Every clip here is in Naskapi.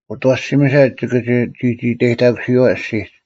ᐅᑦ ᐊᐛᓯᒥᓴ ᒋᑭ ᒋᒋᐃᑕᔨᑕᑯᓯᔨᐛ ᐊᔅᒋᒡ: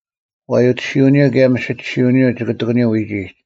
ᐛᔪᑎᓯᐅᓂᔪᐤ ᑭᔭ ᒥᓯᒋᓯᐅᓂᔪᐤ ᒋᑭ ᑎᑯᓂᔪᐤ ᐎᒋᒡ,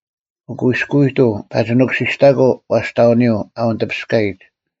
ᐅᑯᐃᔅᑯᑐᐤ ᐸᒋ ᓄᑯᓯᔅᑕᑯᐤ ᐛᔅᑕᐅᓂᔪᐤ ᐊ ᐅᓂᑎᐱᔅᑲᔨᒡ: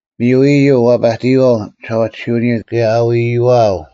ᒥᔪ ᐃᔪᐤ ᐛᐸᑎᔨᐛᐤ ᒋᓴᐛᑎᓯᐅᓂᔪᐤ ᑭᔭ ᐊᐎᐃᐛᐤ: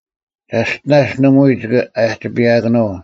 ᒐᔅᑎᓇᔅ ᓇᒪᐎᔾ ᒋᑭ ᐊᒋᐸᔨᐊᑭᓄᐤ,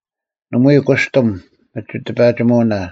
ᓇᒪᐎᔾ ᑯᔅᑎᒻ ᒥᒋᑎᐸᒋᒧᐅᓇ: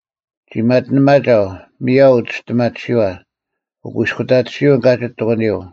ᒋ ᒪᑎᓂᒪᒐᐤ, ᒥᔭᐤ ᐅᒋᔅᑎᒪᑎᓯᐛ; ᐅᑯᐃᔅᑯᑕᑎᓯᐅᓐ ᑲᒋᒡ ᑎᑯᓂᔪᐤ;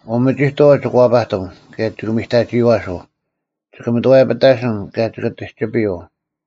ᐅᒥᒋᑥᐤ ᒋᑭ ᐛᐸᑎᒻ, ᑭᔭ ᒋᑭ ᒥᑕᒋᔨᐛᓱᐤ; ᒋᑭ ᒪᑥᔭᐱᑕᓯᓐ, ᑭᔭ ᒋᑭ ᑎᒋᐱᔪᐤ;